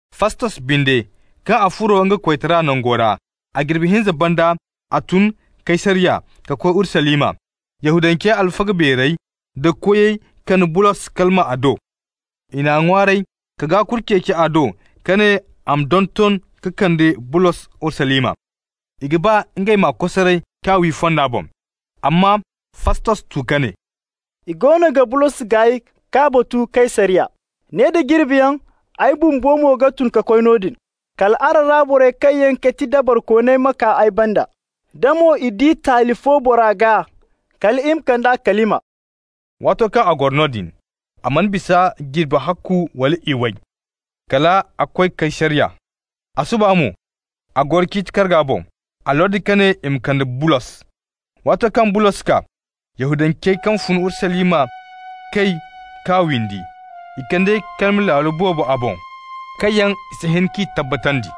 Fastos binde, kaŋ a furo nga koytara nango ra, a jirbi hinza banda, a tun Kaysariya ka koy Urusalima. Yahudancey alfaga beerey da koyey kande Bulos kalima a do. I n'a ŋwaaray ka gaakuri ceeci a do ka ne a ma donton ka kande Bulos Urusalima. I ga ba ngey m'a kosaray k'a wi fonda boŋ. Amma Fastos tu ka ne: «I goono ga Bulos gaay k'a batu Kaysariya. Ne da jirbiyaŋ, ay bumbo mo ga tun ka koy noodin. Kal araŋ ra borey kaŋ yaŋ ga ti dabarikooniyaŋ ma kaa ay banda. Da mo i di taali fo bora gaa, kal i ma kande a kalima.» Waato kaŋ a goro noodin, a mana bisa jirbi ahakku wala iway, kal a koy Kaysariya. A suba mo a goro ciiti karga boŋ. A lordi ka ne i ma kande Bulos. Waato kaŋ Bulos kaa, Yahudancey kaŋ fun Urusalima kay k'a windi. I kande kalima laalo boobo a boŋ, kaŋ yaŋ i si hin k'i tabbatandi.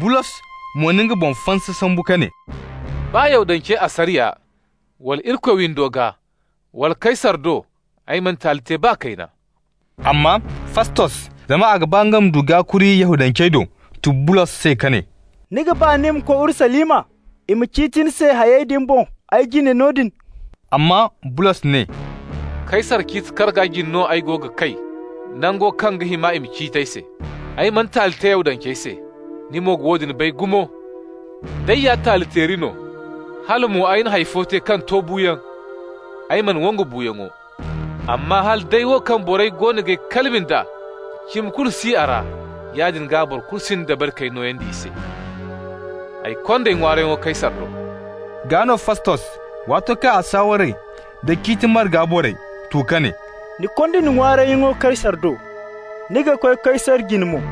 Bulos mo na nga boŋ fansa sambu ka ne: «Baa Yahudancey asariya wala Irikoy windo gaa, wala Kaysar do, ay mana taali te baa kayna.» Amma Fastos, zama a ga ba nga ma du gaakuri Yahudancey do, tu Bulos se ka ne: «Ni ga ba ni ma koy Urusalima, i ma ciiti ni se hayey din boŋ ay jine noodin?» Amma Bulos ne: «Kaysar ciiti karga jine no ay go ga kay, nango kaŋ ga hima i ma ciiti ay se. Ay mana taali te Yahudancey se, ni mo ga woodin bay gumo! D'ay ya taali-teeri no, hala mo ay na hay fo te kaŋ to buuyaŋ, ay mana wangu buuyaŋo. Amma hala day wo kaŋ borey wo goono g'ay kalima nd'a, cimi kulu si a ra, yaadin gaa boro kulu sinda dabari k'ay nooyandi i se. Ay kond'ay ŋwaarayyaŋo Kaysar do.» Gaa no Fastos, waato kaŋ a saaware nda ciiti marga borey, tu ka ne: «Ni konda ni ŋwaarayyaŋo Kaysar do, ni ga koy Kaysar jine mo!»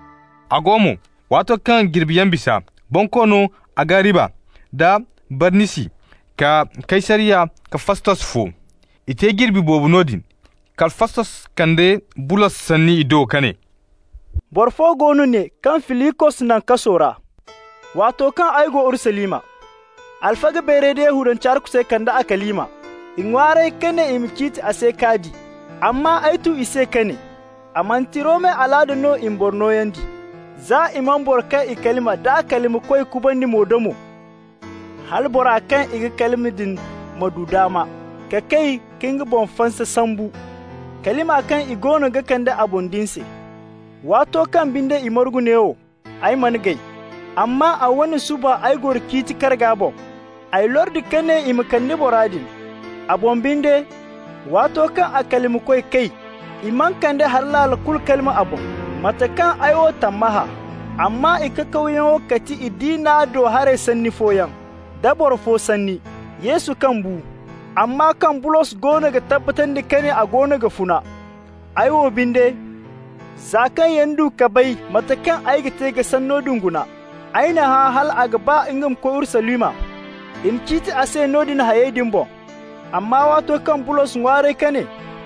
A go mo, waato kaŋ jirbiyaŋ bisa, Bonkoono Agariba da Barnisi kaa Kaysariya ka Fastos fo. I te jirbi boobo noodin. Kala Fastos kande Bulos sanni i do ka ne: «Boro fo go no ne kaŋ Filikos naŋ kaso ra. Waato kaŋ ay go Urusalima, alfaga beerey da Yahudancey arkusey kande a kalima. I ŋwaaray ka ne i ma ciiti a se k'a di. Amma ay tu i se ka ne: ‹A manti Romey alaada no i ma boro nooyandi, za i mana boro kaŋ i kalima d'a kalimakoy kubandi mo-da-mo, hala bora kaŋ i ga kalima din ma du daama ka kay ka nga boŋ fansa sambu kalima kaŋ i goono ga kande a boŋ din se.› Waato kaŋ binde i margu neewo, ay mana gay, amma a wane suba ay goro ciiti karga boŋ. Ay lordi ka ne i ma kande bora din. A boŋ binde, waato kaŋ a kalimakoy kay, i mana kande hari laalo kulu kalima a boŋ, mate kaŋ ay wo tammahã. Amma i kakawyaŋo ga ti i diina do haray sanni fooyaŋ, da boro fo sanni, Yesu kaŋ bu, amma kaŋ Bulos goono ga tabbatandi ka ne a goono ga funa. Ay wo binde, za kaŋ yana du ka bay mate kaŋ ay ga te ka sanno din guna, ay n'a hã hal a ga ba nga ma koy Urusalima, i ma ciiti a se noodin hayey din boŋ. Amma waato kaŋ Bulos ŋwaaray ka ne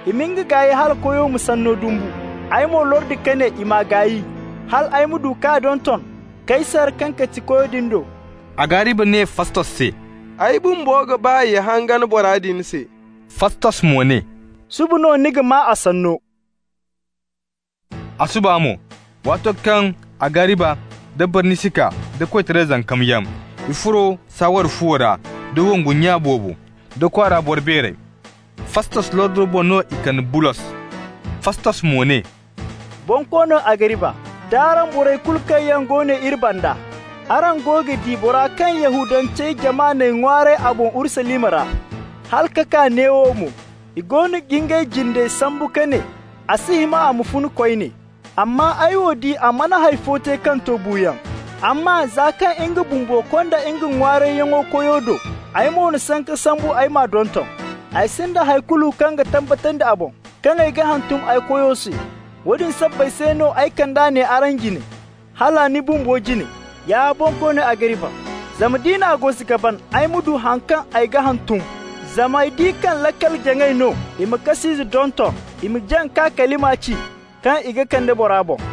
i ma nga gaay hala koyo ma sanno dumbu, ay mo lordi ka ne i m'a gaay hal ay ma du k'a donton Kaysar (kaŋ ga ti koyo din) do.» Agariba ne Fastos se: «Ay bumbo ga ba ya hangan bora din se.» Fastos mo ne: «Suba no ni ga maa a sanno.» A suba mo, waato kaŋ Agariba da Barnisi kaa, da koytaray zankamyaŋ, i furo saaware fuwo ra, da wongu nya boobo, da kwaara boro beerey. Fastos lordo boŋ no i kande Bulos. Fastos mo ne: «Bonkoono Agariba, d'araŋ borey kulu kaŋ yaŋ go ne iri banda, araŋ go ga di bora kaŋ Yahudancey jama n'ay ŋwaaray a boŋ Urusalima ra, hala ka kaa neewo mo. I goono ga ngey jindey sambu ka ne a si hima a ma funa koyne. Amma ay wo di a mana hay fo te kaŋ to buuyaŋ. Amma za kaŋ nga bumbo konda nga ŋwaarayyaŋo koyo do, ay mo na sanka sambu ay m'a donton. Ay sinda hay kulu kaŋ ga tabbatandi a boŋ, kaŋ ay ga hantum ay koyo se. Woodin sabbay se no ay kand'a ne araŋ jine, hala ni bumbo jine, ya Bonkoono Agariba, zama d'i n'a gosi ka ban ay ma du haŋ kaŋ ay ga hantum. Zama ay di kaŋ laakal-jaŋay no i ma kas'ize donton, i ma jaŋ ka kalima ci kaŋ i ga kande bora boŋ.»